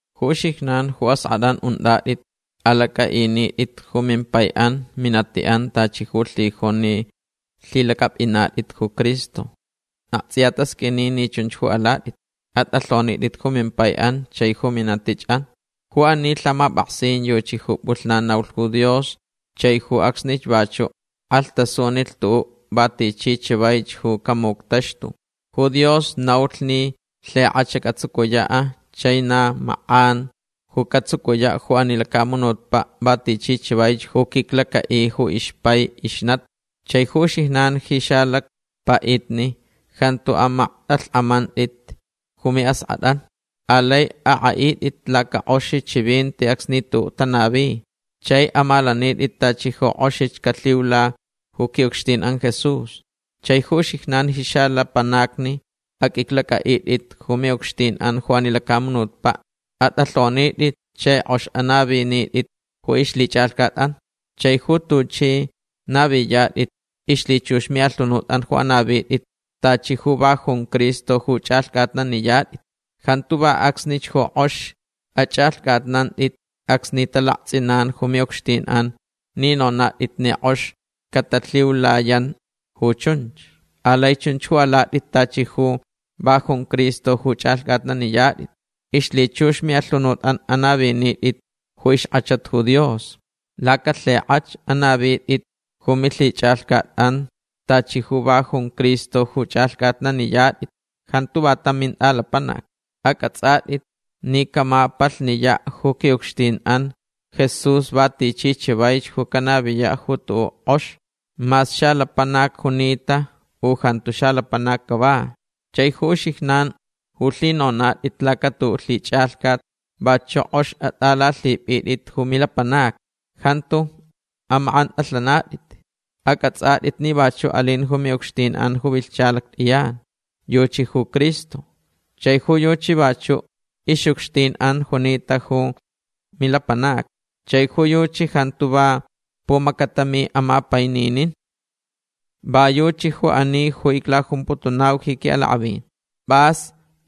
Ju uxijnan ju ask'at'an unt'at'it alac'a'init'it ju mimpai'an minati'an tachi ju lhijun ni lhilac'ap'inat'it ju Cristo. Akts'iya tasq'uini ni chunch ju alat'it. At'alhonit'it ju mimpai'an chai ju minatich'an. Ju ani lhamap'aksin yuchi ju p'ulhnan naulh ju Dios chai ju acsnich vachu' k'alhtasunilh tu'u' va tichi chavaich ju camuctaxtulh. Ju Dios naulh ni lhik'ach catsucuya' chai na mak'anch ju catsucuya' ju ani lacamunutpa' va tichi chavaich ju quiclaca'i ju ixpai ixnati. Chai ju uxijnan ji xalacpa'itni jantu amakt'alhk'amant'it ju mi'ask'at'an. Alai ak'a'it'it lacak'ox chivinti acsni tu'u' tanavi. Chai amalanit'it tachi ju k'oxich calhiula ju qui'ucxtin'an Jesús. Chai ju uxijnan ji xalapanacni aq'uiclac'a'it'it ju mi'ucxtin'an ju ani lacamunutpa'. At'alhonit'it chai k'ox anavinit'it ju ixlhich'alhcat'an. Chai ju tuch'i naviyat'it ixlhichux mi'alhunut'an ju anavit'it tachi ju va jun Cristo ju ch'alhc'atnaniyat'it. Jantu va acsnich ju k'oxich ach'alhc'atnant'it acsni talakts'inan ju mi'ucxtin'an ni nonat'it ni k'ox catalhiulayan ju chunch. Alai chunch ju alat'it tachi ju va jun Cristo ju ch'alhc'atnaniyat'it. Ixlhichux mi'alhunut'an anavinit'it ju ixk'achat ju Dios. Lacalhik'ach anavit'it ju milhich'alhcat'an tachi ju va junch Cristo ju ch'alhc'atnaniyat'it. Jantu va tam mint'alapanac. Ac'ats'at'it ni camapalhniya' ju qui'ucxtin'an Jesús va tichi chavaich ju canaviya' ju tu'u' k'ox. Mas xalapanac junita u jantu xalapanac cava. Chai ju uxijnan ju lhinonat'it lacatu'u' lhich'alhcat vachu' k'ox at'alalhip'it'it ju milapanacni. Jantu amak'ant'alhanat'it. Ac'ats'at'it ni vachu' alin ju mi'ucxtin'an ju vilhcha lact'iyan. Yuchi ju Cristo. Chai ju yuchi vachu' ix'ucxtin'an junita ju milapanacni. Chai ju yuchi jantu va pumacatami amapaininin. Va yuchi ju ani ju iclajumputunau ji qui'alak'avin. P'as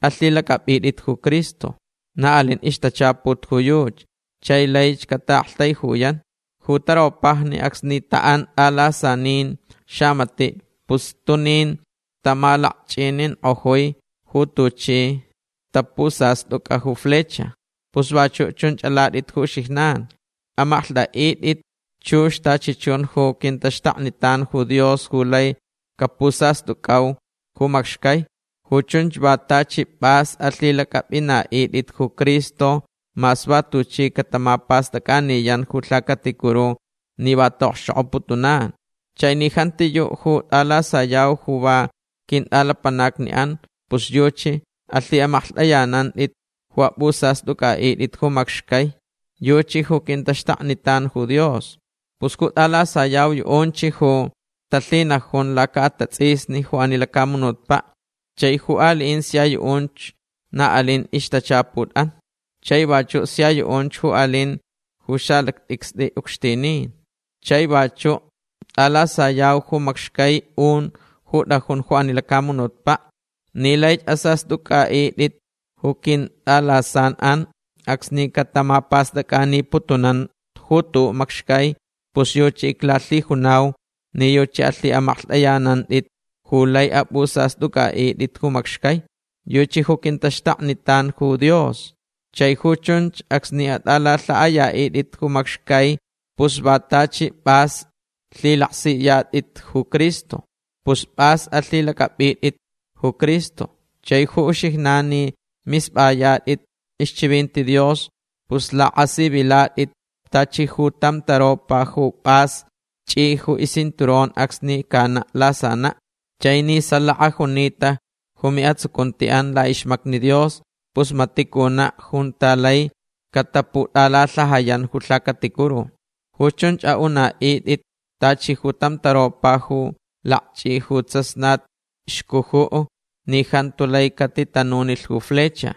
alhilac'ap'it'it ju Cristo. Na alin ixtachaput ju yuchi chai laich cata'aktaijuyan. Ju taropajni acsni ta'an t'alasanin xamati' pus stunin tamalakch'inink'ojui ju tuchi tapusast'uc'a ju flecha. Pus vachu' chunch alat'it ju uxijnan. Amaklht'a'it'it chux tachi chun ju quintaxtaknitan ju Dios ju lai capusast'uc'au ju macxcai. Ju chunch va tachi p'as alhilac'ap'ina'it'it ju Cristo mas va tuchi catamapast'ac'aniyan ju lhacaticuru ni va ta'okxchok'oputunan. Chai ni jantiyu' ju t'alasayau ju va quint'alapanacni'an pus yuchi alhi'amaklht'ayanant'it ju ap'usast'uc'a'it'it ju macxcai. Yuchi ju quintaxtaknitan ju Dios. Pus ju t'alasayau yu'unch ju talhinajun laca'atats'isni ju ani lacamunutpa'. Chai ju ali'in sia yu'unch na alin ixtachaput'an. Chai vachu' sia yu'unch alin ju xalact'icst'i ucxtinin. Chai vachu' t'alasayau ju macxcai un ju t'ajun ju ani lacamunutpa'. Ni laich asast'uc'a'it'it ju quint'alasan'an acsni catamapast'ac'aniputunan ju tu'u' macxcai pus yuchi iclalhijunau ni yuchi alhi'amaklht'ayanant'it ju lai ap'usast'uc'a'it'it ju macxcai. Yuchi ju quintaxtaknitan ju Dios. Chai ju chunch acsni at'alalha'aya'it'it ju macxcai pus va tachi p'as lhilaksiyat'it ju Cristo. Pus p'as alhilac'ap'it'it ju Cristo. Chai ju uxijnan ni misp'ayat'it ixchivinti Dios pus lak'asivilat'it tachi ju tam taropa ju p'as ch'i ju iscinturón acsni cana' lasana'. Chai ni salaka junita ju mi'atsucunti'an la'ixmacni Dios pus mati' cuna' junta lai cataput'alalhajayan ju lhacaticuru. Ju chunch a'una'it'it tachi ju tam taropa ju lakch'i ju tsasnat xcuju' ni jantu lai catitanunilh ju flecha.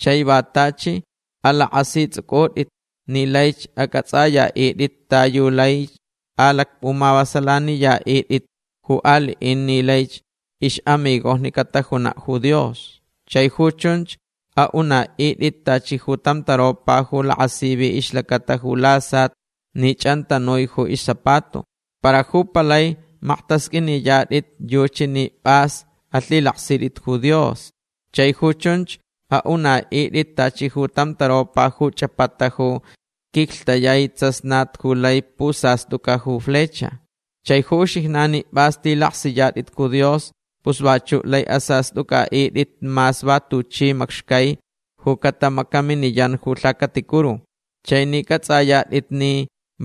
Chai va tachi alak'asits'uc'ut'it ni laich ac'ats'aya'it'it ta yu laich alacp'umavasalaniya'it'it ju ali'in ni laich ix'amigojni catajuna' ju Dios. Chai ju chunch a'una'it'it tachi ju tam taropa ju lakasivi ixlacata ju lasat ni ch'antanui ju iszapato. Para ju palai makt'asq'uiniyat'it yuchi ni p'as alhilaksit'it ju Dios. Chai ju chunch a'una'it'it tachi ju tam taropa ju ch'apata ju quiclhtayai tsasnat ju lai pusast'uc'a ju flecha. Chai ju uxijnan ni p'as lhilaksiyat'it ju Dios pus vachu' lai asast'uc'a'it'it mas va tuchi macxcai ju catamacaminiyan ju lhacaticuru. Chai ni c'ats'ayat'it ni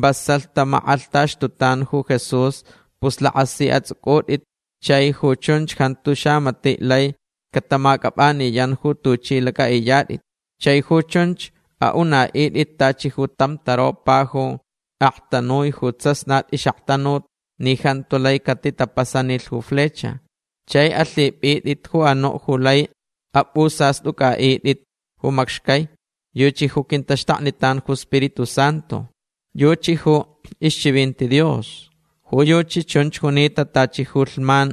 vasalh tamak'alhtaxtutan ju Jesús pus lak'asi ats'uc'ut'itch chai ju chunch jantu xamati' lai catamac'ap'aniyan ju tuch'i lac'a'iyat'it. Chai ju chunch a'una'it'it tachi ju tam taropa ju aktanui ju tsasnat ix'aktanut ni jantu lai catitapasanilh ju flecha. Chai alhip'it'it ju anu' ju lai ap'usast'uc'a'it'it ju macxcai. Yuchi ju quintaxtaknitan ju Spiritu Santu. Yuchi ju ixchivinti Dios. Ju yuchi chunch junita tachi ju lhman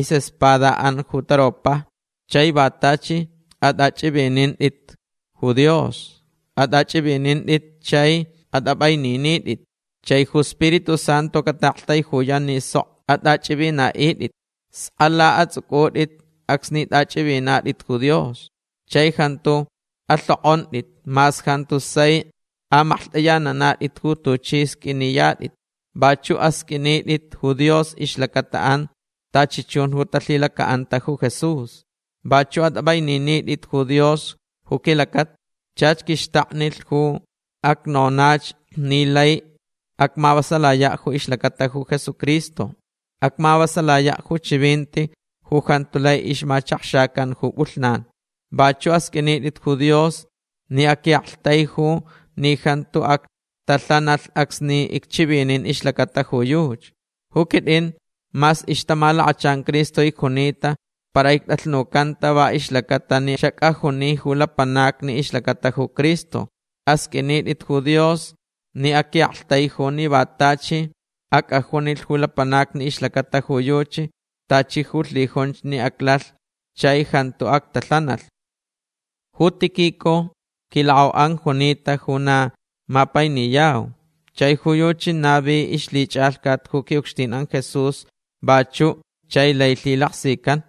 is'espada'an ju taropajni. Chai va tachi at'ach'ivinint'it ju Dios. At'ach'ivinint'it chai at'ap'aininit'it. Chai ju Spiritu Santu cata'aktaijuyan ni sok at'ach'ivina'it'it. Skala ats'uc'ut'it acsni t'ach'ivinat'it ju Dios. Chai jantu alhok'ont'it mas jantu sai amaklht'ayananat'it ju tuch'i sq'uiniyat'it. Vachu' asq'uinit'it ju Dios ixlacata'an tachi chun ju talhilaca'anta ju Jesús. Vachu' at'ap'aininit'it ju Dios ju quilacata. Chach quixtaknilh ju acnonach ni laich acmavasalaya' ju ixlacata ju Jesucristo. Acmavasalaya' ju chivinti ju jantu lai ixmachakxacan ju p'ulhnan. Vachu' asq'uinit'it ju Dios ni aqui'aktaijulh ni jantu actalhanalh acsni icchivinin ixlacata ju yuchi. Ju quit'in mas ixtamalakachan Cristo icjunita para ict'alhnucanta va ixlaca'atalh ni xac'ajuni ju lapanacni ixlacata ju Cristo. Asq'uinit'it ju Dios ni aqui'aktaiju ni va tachi ac'ajunilh ju lapanacni ixlacata ju yuchi tachi ju lhijunch ni aclalh chai jantu actalhanalh. Ju Tíquico quilak'au'an junita ju na mapainiyau. Chai ju yuchi navi ixlhich'alhcat ju qui'ucxtin'an Jesús vachu' chai lai lhilaksican.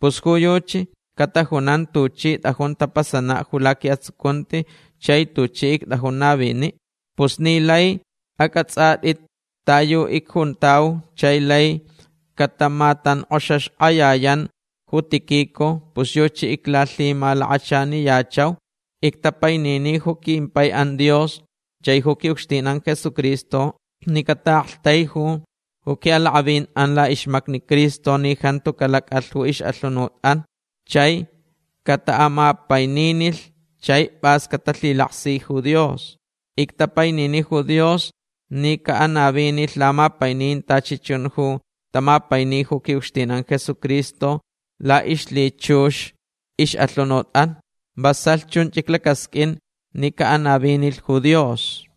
Pus ju yuchi catajunan tuchi t'ajun tapasana' ju laqui'atsucunti chai tuchi ict'ajun navini'. Pus ni laich ac'ats'at'it ta yu icjuntau chai laich catamatank'oxaxk'ayayan ju Tíquico pus yuchi iclalhimalakachaniyachau. Ictapainini ju quimpai'an Dios chai ju qui'ucxtin'an Jesucristo ni cata'a'aktaiju ju qui'alak'avin'an la'ixmacni Cristo ni jantu calac'alh ju ix'alhunut'an chai cata'amapaininilh chai p'as catalhilaksilh ju Dios. Ictapainini ju Dios ni ca'anavinilh lamapainin tachi chun ju tamapaini ju qui'ucxtin'an Jesucristo la'ixlhichux ix'alhunut'an. Vasalh chunch iclacasq'uin ni ca'anavinilh ju Dios.